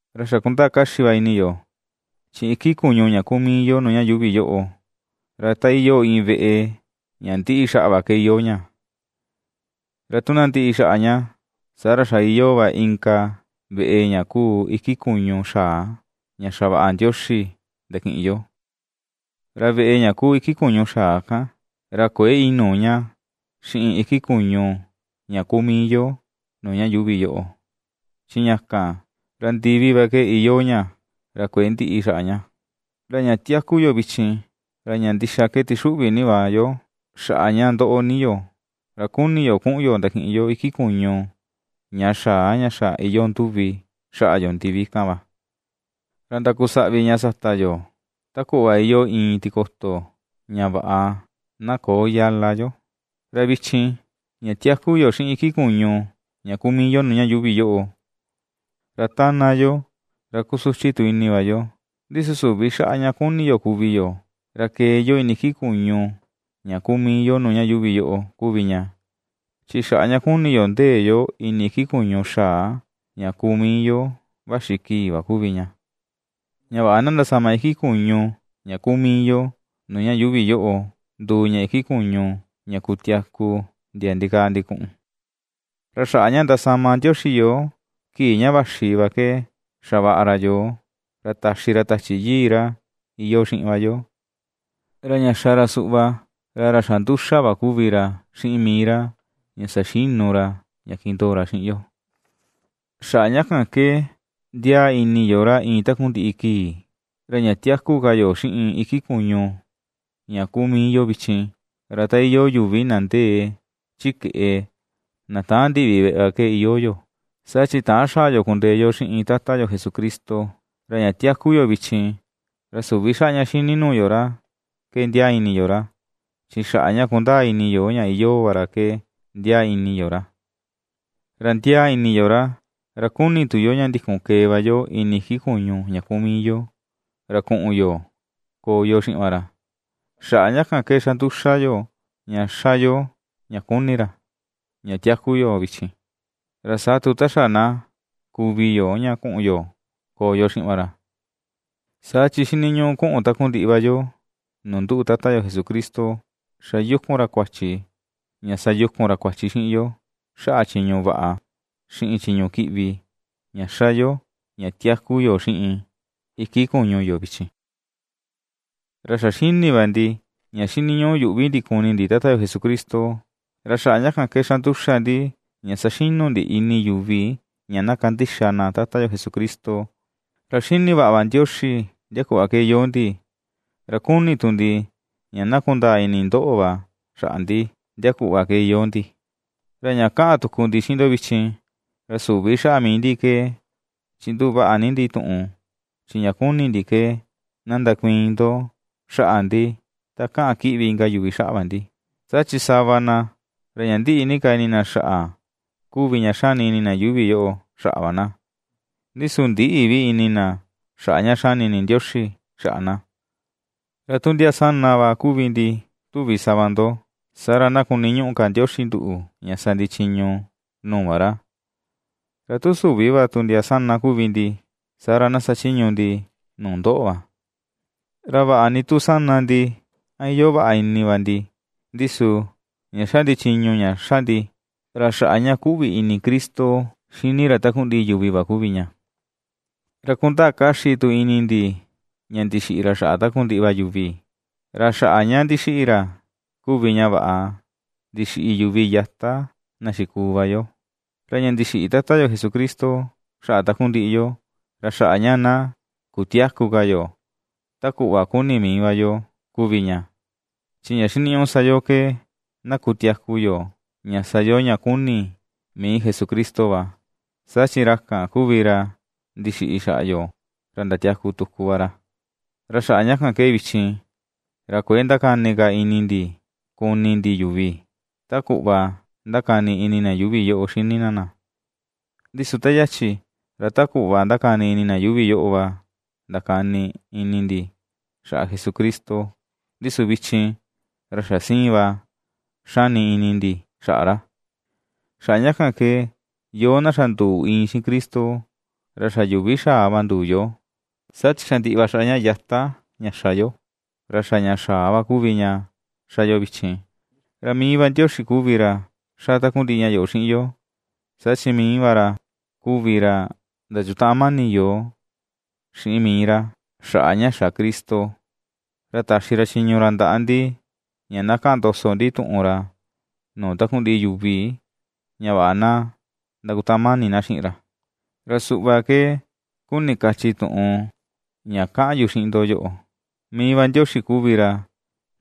Ra xa kundaa kaxi va ini yo, chi iki kuñu ña kuu mii yo nuu ña yuuvi yoꞌo, ra ta iyoo iin veꞌe ña ndiꞌi xaꞌa va ke iyoo ña, ra tu na ndiꞌi xaꞌa ña, saa ra xa iyoo va inka veꞌe ña kuu iki kuñu xaa ña xavaꞌa Ndioxi ndakiꞌin yo, ra veꞌe ña kuu iki kuñu xaa kan, ra kuëe inuu ña xiꞌin iki kuñu ña kuu mii yo nuu ña yuuvi yoꞌo, chi ña kan, ra ndivi va ke iyoo ña, ra kuëe ndiꞌi xaꞌa ña. Ra ña tiaku yo vichin, ra ña ndixa ke tixuꞌvi ni va yo xaꞌa ña ndoꞌo ni yo, ra kuni ni yo kuꞌun yo ndakiꞌin yo iki kuñu ña xaa ña xa iyoo nduvi xaꞌa yo ndivi kan va, ra ndakusaꞌvi ña sata yo, ta kuꞌva iyoo iin tikoto, ña vaꞌa na köo yala yo. Ra vichin, ña tiaku yo xiꞌin iki kuñu ña kuu mii yo nuu ña yuuvi yoꞌo, ra ^tána yo, ra kusuchi tu ini va yo, ndi su süvi xaꞌa ña kuni yo kuvi yo, ra kee yo ini iki kuñu ña kuu mii yo nuu ña yuuvi yoꞌo kuvi ña. Chi xaꞌa ña kuni yo ndee yo ini iki kuñu xaa ña kuu mii yo vaxi kii va kuvi ña, ña vaꞌa na ndasama iki kuñu ña kuu mii yo nuu ña yuuvi yoꞌo nduu ña iki kuñu ña kutiaku ndia ndikaa ndikuꞌun. Ra xaꞌa ña ndasama Ndioxi yoo kii ña vaxi va ke xavaꞌa ra yoo. Ra taxi ra Tachi Yii ra iyoo xiꞌin va yo, ra ña xa ra suꞌva ra ra xa nduxa va kuvi ra xiꞌin mii ra ña saxinu ra ña kindoo ra xiꞌin yo. Xaꞌa ña kan ke, ndiaa ni ini yo ra iin takundiꞌi kii. Ra ña tiaku ka yo xiꞌin iki kuñu ña kuu mii yo vichin, ra ta iyoo yuvi na ndee chi keꞌe, na täan ndiꞌvi veꞌe va ke iyoo yo, saa chi täan xaa yo kundee yo xiꞌin Tata yo Jesucristo. Ra ña tiaku yo vichin, ra süvi xaꞌa ña ^xini nuu yo ra ke ndiaa ini yo ra, chi xaꞌa ña kundaa ini yo ña iyoo va ra ke ndiaa ini yo ra. Ra ^ndiaa ini yo ra, ra kuni tu yo ña ndikun kee va yo ini iki kuñu ña kuu mii yo, ra kuꞌun yo koo yo xiꞌin va ra. Xaꞌa ña kan ke ^xa nduxa yo, ña ^xa yo ña kuni ra, ña tiaku yo vichin, ra saa tu, ta xa na kuvi yo ña kuꞌun yo koo yo xiꞌin va ra. Saa chi xiniñuꞌu kuꞌun takundiꞌi va yo nuu nduꞌu Tata yo Jesucristo ^xa yukun ra kuachi, ña sayukun ra kuachi xiꞌin yo xaꞌa chiñu vaꞌa, xiꞌin chiñu kiꞌvi ña ^xa yo ña tiaku yo xiꞌin iki kuñu yo vichin. Ra xa xini va ndi, ña xiniñuꞌu yuꞌvi ndi kuni ndi Tata yo Jesucristo, ra xaꞌa ña kan ke xa nduxa ndi ña saxinu ndi ini yuvi ña na kandixa na Tata yo Jesucristo. Ra xini vaꞌa va Ndioxi ndia kuꞌva ke iyoo ndi, ra kuni tu ndi ña na kundaa ini ndoꞌo va xaꞌa ndi, ndia kuꞌva ke iyoo ndi. Ra ña kaꞌan tuku ndi xiꞌin ndo vichin, ra süvi xaꞌa mii ndi ke chinduꞌu vaꞌa ni ndi tuꞌun, chi ña kuni ndi ke na ndakuiin ndo xaꞌa ndi ta kaꞌan kiꞌvi inka yuvi xaꞌa va ndi, saa chi sava na, ra ña ndiꞌi ni ka ini na xaꞌa kuvi ña xani ini na yuuvi yoꞌo xaꞌa va na, ndi su ndïꞌi vi ini na xaꞌa ña xani ini Ndioxi xaꞌa na. Ra tu ndia sana va kuvi ndi tuvi sava ndo, saa ra na kuniñuꞌu ka Ndioxi nduꞌu ña sa ndi chiñu nuu va ra, ra tu süvi va tu ndia sana kuvi ndi, saa ra na sachiñu ndi nuu ndoꞌo va. Ra vaꞌa ni tu sana ndi a iyoo vaꞌa ini va ndi, ndi su, ña xa ndi chiñu ña xa ndi, ra xaꞌa ña ^kuꞌvi ini Cristo xini ra takundiꞌi yuvi va kuvi ña, ra kundaa kaxi tu ini ndi ña ndixiꞌi ra xaꞌa takundiꞌi va yuvi, ra xaꞌa ña ndixiꞌi ra kuvi ña vaꞌa ndixiꞌi yuvi yata na xikuu va yo. Ra ña ndixiꞌi Tata yo Jesucristo xaꞌa takundiꞌi yo, ra xaꞌa ña na kutiäku ka yo ta kuꞌva kuni mii va yo kuvi ña, chi ña xiniñuꞌu sa yo ke na kutiaku yo, ña sa yo ña kuni mii Jesucristo va, saa chi ra kan kuvi ra ndixiꞌi xaꞌa yo ra ndatiaku tuku va ra. Ra xaꞌa ña kan ke vichin, ra kuëe ndakani ka ini ndi kuni ndi yuvi, ta kuꞌva ^ndakani ini na yuuvi yoꞌo xini na na; ndi su ta yachi, ra ta kuꞌva ^ndakani ini na yuuvi yoꞌo va ndakani ini ndi xaꞌa Jesucristo, ndi su vichin, ra xa sïin va xani ini ndi xaꞌa ra. Xaꞌa ña kan ke, yoo, na xa nduu iin xiꞌin Cristo, ra xa yuvi xaa va nduu yo; saa chi xa ndiꞌi va xaꞌa ña yata ña xa yo, ra xa ña xaa va kuvi ña ^xa yo vichin. Ra mii va Ndioxi kuvi ra ^xa takundiꞌi ña yoꞌo xiꞌin yo, saa chi mii va ra kuvi ra ndachutaꞌan mani yoo xiꞌin mii ra, xaꞌa ña xa Cristo, ra taxi ra chiñu ra ndaꞌa ndi, ña na kaꞌan ndoso ndi tuꞌun ra nuu takundiꞌi yuvi ña vaꞌa na ndakutaꞌan mani na xiꞌin ra. Ra suꞌva ke kuni kachi tuꞌun ña kaꞌan yu xiꞌin ndo yoꞌo: Mii va Ndioxi kuvi ra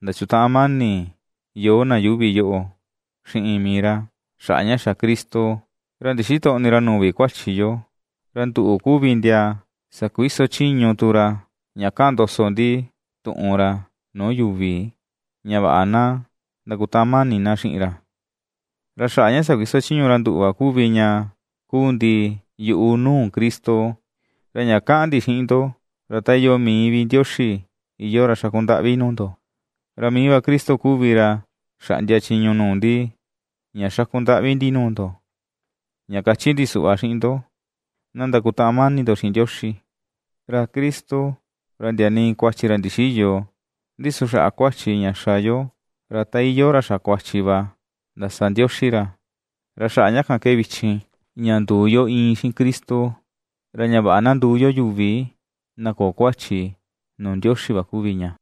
ndachutaꞌan mani yoo na yuuvi yoꞌo xiꞌin mii ra, xaꞌa ña xa Cristo. Ra ndixitöꞌni ra nuu vi kuachi yo; ra nduꞌu kuvi ndia sakuiso chiñu tu ra, ña kaꞌan ndoso ndi tuꞌun ra nuu yuvi, ña vaꞌa na ndakutaꞌan mani na xiꞌin ra. Ra xaꞌa ña sakuiso chiñu ra nduꞌu va kuvi ña kuu ndi yuꞌu nuu Cristo, ra ña kaꞌan ndi xiꞌin ndo, ra ta iyoo mii vi Ndioxi iyoo ra xaku ndaꞌvi nuu ndo. Ra mii va Cristo kuvi ra xaꞌndia chiñu nuu ndi, ña xaku ndaꞌvi ndi nuu ndo, ña kachi ndi suꞌva xiꞌin ndo: na ndakutaꞌan mani ndo xiꞌin Ndioxi. Ra Cristo, ra ndia nii kuachi ra ndixïyo; ndi su xaꞌa kuachi ña xa yoo, ra ta iyoo ra xa kuachi va ndasa Ndioxi ra, ra xaꞌa ña kan ke vichin ña nduu yo iin xiꞌin Cristo, ra ña vaꞌa na nduu yo yuvi na köo kuachi nuu Ndioxi va kuvi ña.